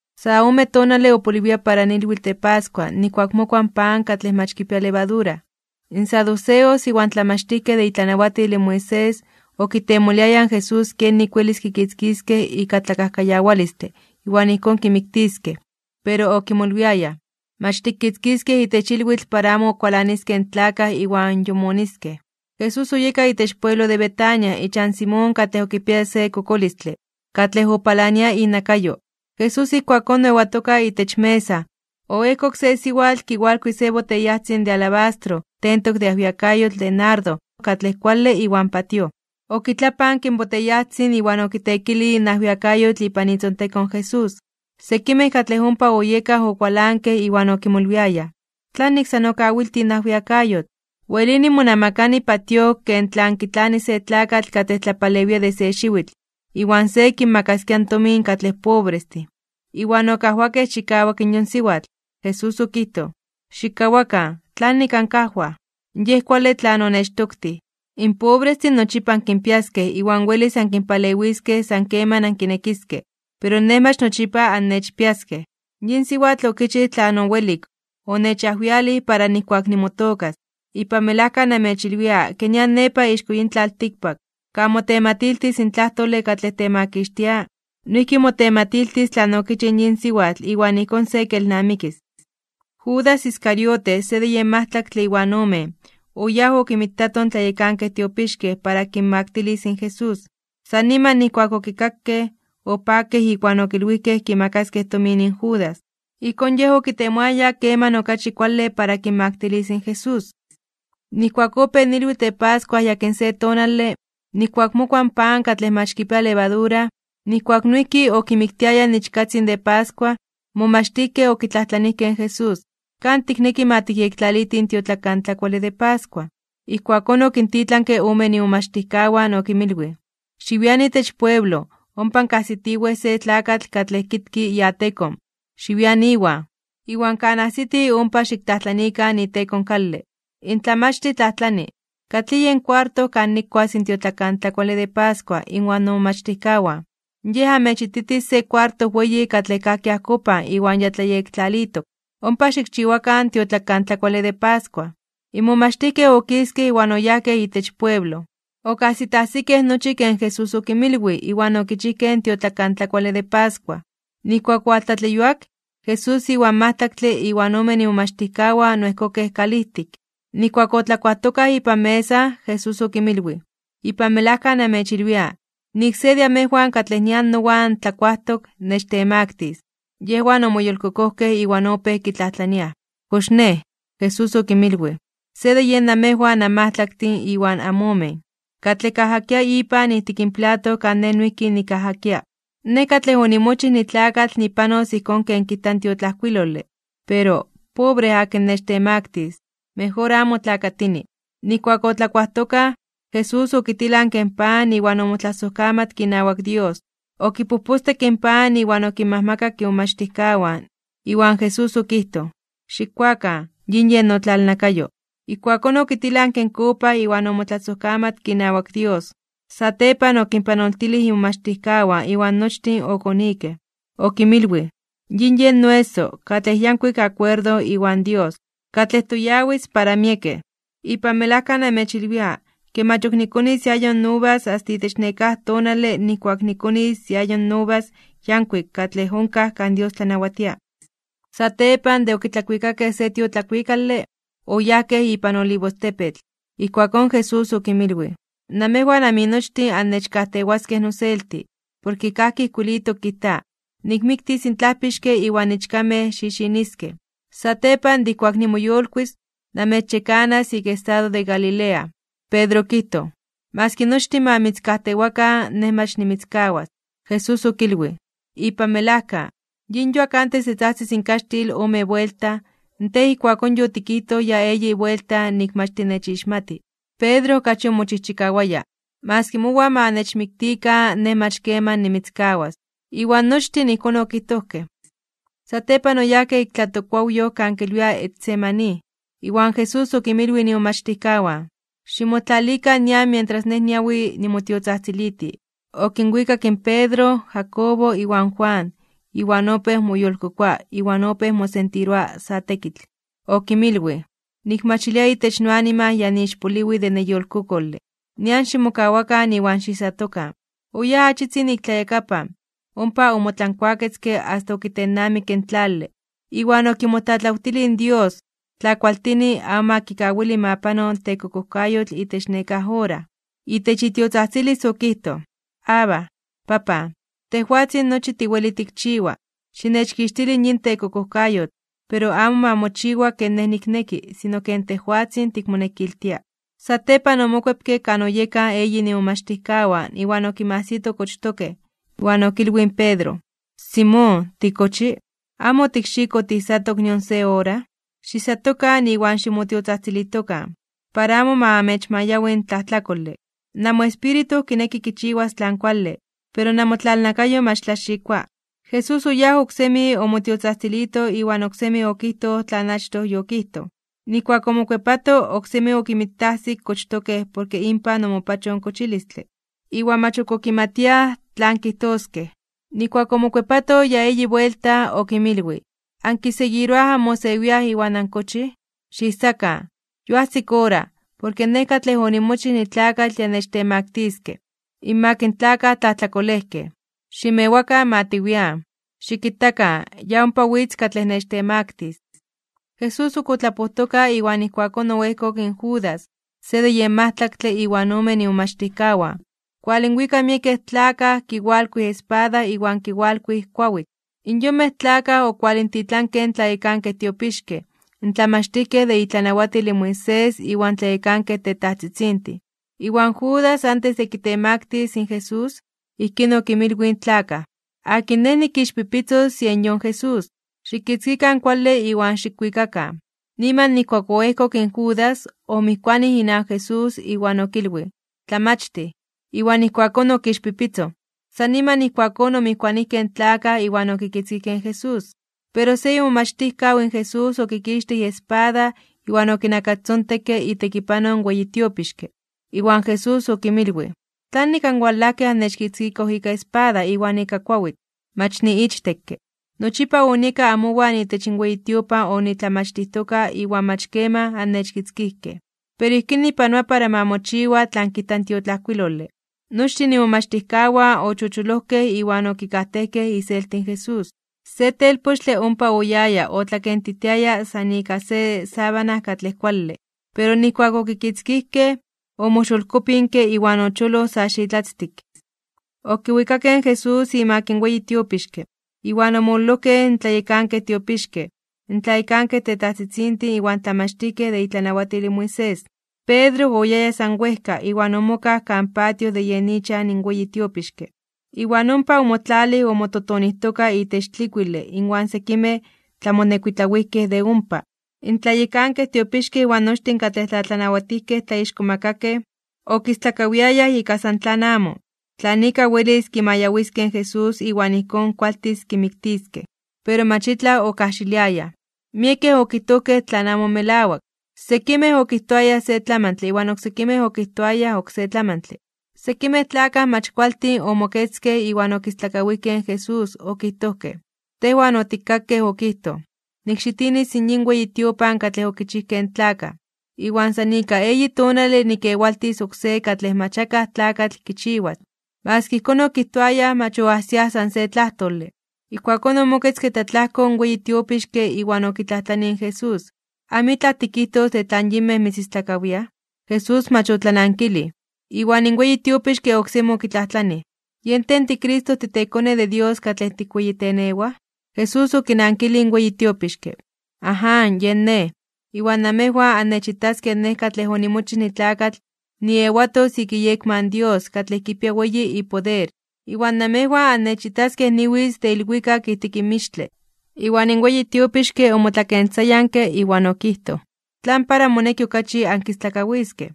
Sa ome tonale opoliwia para ilwitl de pascua nijkuak mokua in pan katlej mach kipia levadura. In saduceos iwan tlamachtijkej de itlanawatil in Moisés, okitemoliayaj in Jesús kenik welis kikitzkiskej ika tlakajkayawalistle iwan ijkón kimiktiskej. Pero okimolwiayaj: ―Mach tikitzkiskej itech ilwitl para amo kualaniskej in tlakaj iwan yomoniskej. Jesús oyeka itech pueblo de Betania ichan Simón katlej okipiaya se kokolistle, katlej opalania inakayo. Jesús ijkuakón oewatoka itech mesa, oejkok se siwatl kiwalkui se boteyajtzin de alabastro tentok de ajwiakayotl de nardo katlej kuale iwan patíoj, okitlapanke in boteyajtzin iwan okiteekilij in ajwiakayotl ipan itzontekon in Jesús. Sekimej katlej ompa oyekaj okualankej iwan okimolwiayaj: ―¿Tlanik san okawiltij in ajwiakayotl? Welini monamakani patíoj ken tlan kitlani se tlakatl katlej tlapalewia de se xiwitl, iwan se kinmakaskia in tomin katlej pobrestin. Iwan okajwakej chikawak in yon siwatl. Jesús okijtoj: ―Xikkawakan, ¿tlanik ankajwaj? Yej kuale tlan onechtoktij. In pobrestin nochipa ankinpiaskej iwan welis ankinpalewiskej san keman ankinekiskej, pero Nej mach nochipa annechpiaskej. Yin siwatl okichij tlan owelik. Yonechajwialij para ijkuak nimotookas. Ipan melajka namechilwia ke nian nepa ixko yin tlaltikpak, kan motematiltis in tlajtole katlej temakixtia, noijki motematiltis tlan okichij in yin siwatl iwan ijkón se kelnamikis. Judas Iscariote, se de yen majtlaktle iwan omen, oyáj okinmitato in tlayekankej tiopixkej para kinmaktilis in Jesús. San niman nijkuak okikakej, opakej iwan okilwijkej kimakaskej tomin in Judas. Ijkón yej okitemoaya keman okachi kuale para kinmaktilis in Jesús. Nijkuak opéj ilwitl de pascua yakin se tonale, nijkuak mokua in pan katlej mach kipia levadura, nijkuak noijki okimiktiayaj in ichkatzin de pascua, in momachtijkej okitlajtlanijkej in Jesús: ―¿Kan tikneki ma tikyektlalitij in tiotlakantlakuale de pascua? Ijkuakón okintitlanke omen imomachtijkawan okinmilwij: ―Xiwian itech pueblo, ompa ankajsitiwej se tlakatl katlej kitki iatekon. Xiwian iwan. Iwan kan ajsiti ompa xiktlajtlanikan iteko in kale: “In Tlamachtij tlajtlani: ¿Katlij yen kuarto kan nikuas in tiotlakantlakuale de pascua inwan nomomachtijkawan?” Yej amechititis se kuarto weyi katlej kajki ajkopan iwan ya tlayektlalitok. Ompa xikchiwakan in tiotlakantlakuale de pascua. In momachtijkej okiskej iwan oyajkej itech pueblo. Okajsitajsikej nochi ken Jesús okinmilwij iwan okichijkej in tiotlakantlakuale de pascua. Nijkuak owaltlatleyuak, Jesús iwan majtlaktle iwan omen imomachtijkawan oejkokej kalijtik. Nijkuak otlakuajtokaj ipan mesa, Jesús okinmilwij: ―Ipan melajka namechilwia, nik se de amejwan katlej nian nowan tlakuajtok, nechtemaktis (nechtemaktilis). Yejwan omoyolkokojkej iwan opéj kitlajtlaniaj se por se: ―¿Kox nej? Jesús okinmilwij: ―Se de yen namejwan anmajtlaktin iwan amomen, katlej kajakia ipan ijtik in plato kan Nej noijki nikajakia. Nej katlej onimochij nitlakatl nipanos ijkón ken kijta in tiotlajkuilole, pero ¡pobre akin nechtemaktis (nechtemaktilis)! Mejor amo tlakatini. Nijkuak otlakuajtokaj, in Jesús okitilanke in pan iwan omotlasojkamatke inawak Dios. Okipojpostekke in pan iwan okinmajmakak imomachtijkawan, iwan Jesús okijtoj: ―Xikkuakan, yin yen notlalnakayo. Ijkuakón okitilanke in kopa iwan omotlasojkamatke inawak Dios, satepan okinpanoltilij imomachtijkawan iwan nochtin okonikej. Okinmilwij: ―Yin yen noeso, katlej yankuik akuerdo inawak Dios, katlej toyawis para miekej. Ipan melajka namechilwia, ke mach ok nikonis iayo uvas asta itech nekáj tonale nijkuak nikonis iayo uvas yankuik katlej onkaj kan Dios tlanawatia. Satepan de okitlakuikakej se tiotlakuikale, oyajkej ipan Olivostepetl. Ijkuakón Jesús okinmilwij: ―Namejwan aminochtin annechkajtewaskej noselti, porke kajki ijkuilitok kijta: “Nikmiktis in tlajpixke iwan ichkamej xixiniskej.” Satepan de ijkuak nimoyolkuis (nimoyolitis), namechyekanas ik estado de Galilea. Pedro okijtoj: ―Maski nochtin ma mitzkajtewakan, nej mach nimitzkawas. Jesús okilwij: ―Ipan melajka, yin yuak antes de tzajtzis in kaxtil ome buelta, tej ijkuakón yotikijtoj ya eyi buelta nik mach tinechixmati. Pedro okachi omochijchikawaya: ―Maski mowan ma nechmiktikan, nej mach keman nimitzkawas. Iwan nochtin ijkón okijtojkej. Satepan oyajkej ik tlatokkuawyoj kan kilwiaj Getsemaní, iwan Jesús okinmilwij imomachtijkawan: ―Ximotlalikan nian mientras Nej niawi nimotiotzajtziliti. Okinwikak in Pedro, Jacobo iwan Juan, iwan opéj moyolkokoa iwan opéj mosentiroa sa tekitl. Okinmilwij: ―Nikmachilia itech noanima ya niixpoliwi de neyolkokole. Nian ximokawakan iwan xiijsatokan. Oyáj achitzin ik tlayakapan, ompa omotlankuaketzke asta okitennamikke in tlale. Iwan okimotlatlawtilij in Dios, tla kualtini, amo ma kawili ma pano tekokojkayotl itech nekáj ora. Itech itiotzajtzilis okijtoj: ―Abba, Papan, tejwatzin nochi tiweli tikchiwa, xinechkixtili yin tekokojkayotl, pero amo ma mochiwa ken Nej nikneki, sino ken tejwatzin tikmonekiltia. Satepan omokuepke kan oyekaj eyin imomachtijkawan iwan okinmajsito kochtokej, iwan okilwij in Pedro: ―Simón, ¿tikochi? ¿Amo otikxikoj tiijsatok nion se ora? Xiijsatokan iwan ximotiotzajtzilijtokan, para amo ma amechmayawi in tlajtlakole, namoespíritu kineki kichiwas tlan kuale, pero namotlalnakayo mach tlaxikoa. Jesús oyáj oksemi omotiotzajtzilito iwan oksemi okijtoj tlan achtoj yokijtoj. Nijkuak omokuepato, oksemi okinmitajsik kochtokej porke inpan omopachoj in kochilistle. Iwan mach ok okimatiaj tlan kijtoskej. Nijkuak omokuepato ya eyi buelta, okinmilwij: ―¿Ankiseguiroaj anmosewiaj iwan ankochij? ¡Xiijsakan! Yoajsik ora, porke Nej katlej onimochij nitlakatl ya nechtemaktiskej (nechtemaktiliskej) inmak in tlakaj tlajtlakolejkej. ¡Ximewakan ma tiwian! Xikitakan, ya ompa witz katlej nechtemaktis. Jesús ok otlapojtoka iwan ijkuakón oejkok in Judas, se de yen majtlaktle iwan omen imomachtijkawan, kualinwika miekej tlakaj kiwalkuij espada iwan kiwalkuij kuawitl. In yonmej tlakaj okualintitlankej in tlayekankej tiopixkej, in tlamachtijkej de itlanawatil in Moisés iwan tlayekankej tetajtzitzintin. Iwan Judas antes de kitemaktis (kitemaktilis) in Jesús, ijkín okinmilwij in tlakaj: ―Akin nej nikixpipitzos yen yon Jesús, xikitzkikan kuale iwan xikwikakan. Niman nijkuak oejkok in Judas, omijkuanij inawak Jesús iwan okilwij: ―¡Tlamachtij! Iwan ijkuakón okixpipitzoj. San niman ijkuakón omijkuanijkej in tlakaj iwan okitzkijkej in Jesús. Pero se imomachtijkaw in Jesús okikixtij iespada iwan okinakastzontekke itekipanoj in weyi tiopixke. Iwan Jesús okinmilwij: ―¿Tlanik anwalajkej annechkitzkikoj ika espada iwan ika kuawitl? Mach niichtekke. Nochipa onieka amowan itech in weyi tiopan onitlamachtijtoka iwan mach keman annechkitzkijkej. Pero ijkín nipanoa para ma mochiwa tlan kijta in tiotlajkuilole. Nochtin imomachtijkawan ochocholojkej iwan okikajtejkej iselti in Jesús. Se telpochtle ompa oyaya otlakentitiaya san ika se sábana katlej kuale, pero nijkuak okitzkijkej, omoxolkopinke iwan ocholoj sa xitlatztik. Okiwikakej in Jesús imak in weyi tiopixke, iwan omololojkej in tlayekankej tiopixkej, in tlayekankej tetajtzitzintin iwan tlamachtijkej de itlanawatil in Moisés. Pedro oyaya san wejka iwan omokaj kan patio de yen ichan in weyi tiopixke, iwan ompa omotlalij omototonijtoka itech tlikuile inwan sekimej tlamonekuitlawijkej de ompa. In tlayekankej tiopixkej iwan nochtin katlej tlatlanawatijkej tlaixkomakakej (tlatzonmankej), okistlakawiayaj ika san tlan amo, tlan ika welis kimayawiskej in Jesús iwan ijkón kualtis kimiktiskej, pero mach itlaj okajxiliayaj. Miekej okijtojkej tlan amo melawak (tlen amo ijkón). Sekimej okijtoayaj se tlamantle iwan oksekimej okijtoayaj oksé tlamantle. Sekimej tlakaj mach kualtin omoketzkej iwan okistlakawijkej in Jesús okijtojkej: ―Tejwan otikkakej okijtoj: “Nikxitinis yin weyi tiopan katlej okichijkej in tlakaj, iwan san ika eyi tonale nikkewaltis oksé katlej mach akaj tlakatl kichiwas.” Maski ijkón okijtoayaj mach oajsiaj san se tlajtole. Ijkuakón omoketzke tlatlajko in weyi tiopixke iwan okitlajtlanij in Jesús: ―¿Amitlaj tikijtos de tlan yinmej mitzistlakawiaj? Jesús mach otlanankilij. Iwan in weyi tiopixke oksemi okitlajtlanij: ―¿Yen tej tiCristo titeKone de Dios katlej tikweyitenewaj? Jesús okinankilij in weyi tiopixke: ―Aján, yen Nej, iwan namejwan annechitaskej Nej katlej onimochij nitlakatl niewatos ik iyekma in Dios katlej kipia weyi ipoder, iwan namejwan annechitaskej niwitz de ilwikak ijtik mixtle. Iwan in weyi tiopixke omotlakentzayanke iwan okijtoj: ―¿Tlan para moneki okachi ankistlakawiskej?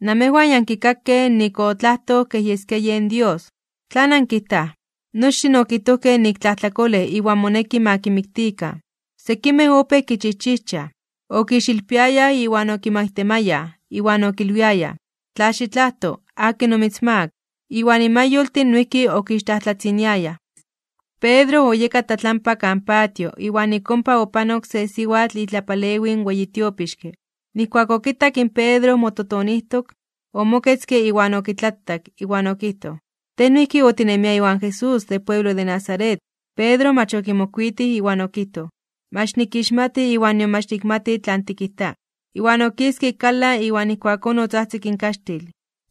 ¡Namejwan ya ankikakej nik otlajtoj kej yeskia yen Dios! ¿Tlan ankijtaj? Nochtin okijtojkej nik tlajtlakolej iwan moneki ma kimiktikan. Sekimej opéj kichijchijchaj, okixilpiayaj iwan okimaitemayaj, iwan okilwiayaj: ―¡Tla xitlajto (xikadibinaro), akin omitzmaak! Iwan mayoltin noijki okixtlajtlatziniayaj. Pedro oyeka tlatlampa kan patio, iwan ik ompa opanok se siwatl itlapalewij in weyi tiopixke. Nijkuak okitak in pedro mototonijtok, omoketzke iwan okitlatak, iwan okijtoj: ―Tej noijki otinemia iwan Jesús de pueblo de Nazaret. Pedro mach okimokuitij iwan okijtoj: ―Mach nikixmati iwan nion mach nikmati tlan tikijta. Iwan okiske ik kalan iwan ijkuakón otzajtzik in kaxtil.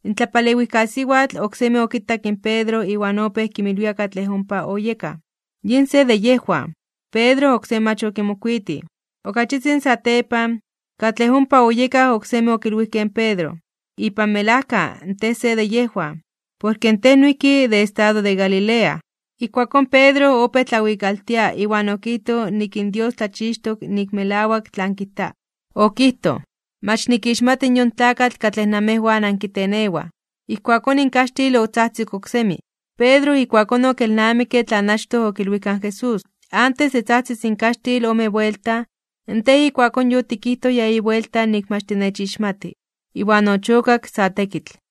In tlapalewijkasiwatl, oksemi okitak in Pedro iwan opéj kinmilwia katlej ompa oyekaj: ―Yin se de yejwan. Pedro oksemi mach okimokuitij. Ok achitzin satepan, katlej ompa oyekaj oksemi okilwijkej in Pedro: ―Ipan melajka, tej se de yejwan, porke in tej noijki de estado de Galilea. Ijkuakón Pedro opéj tlawikaltia iwan okijtoj nik in Dios tlachixtok nik melawak tlan kijta. Okijtoj: ―Mach nikixmati yon tlakatl katlej namejwan ankitenewaj. Ijkuakón in kaxtil otzajtzik oksemi. Pedro ijkuakón okelnamikke tlan achtoj okilwijka in Jesús: “Antes de tzajtzis in kaxtil ome buelta, tej ijkuakón yotikijtoj ya eyi buelta nik mach tinechixmati.” Iwan ochokak sa tekitl.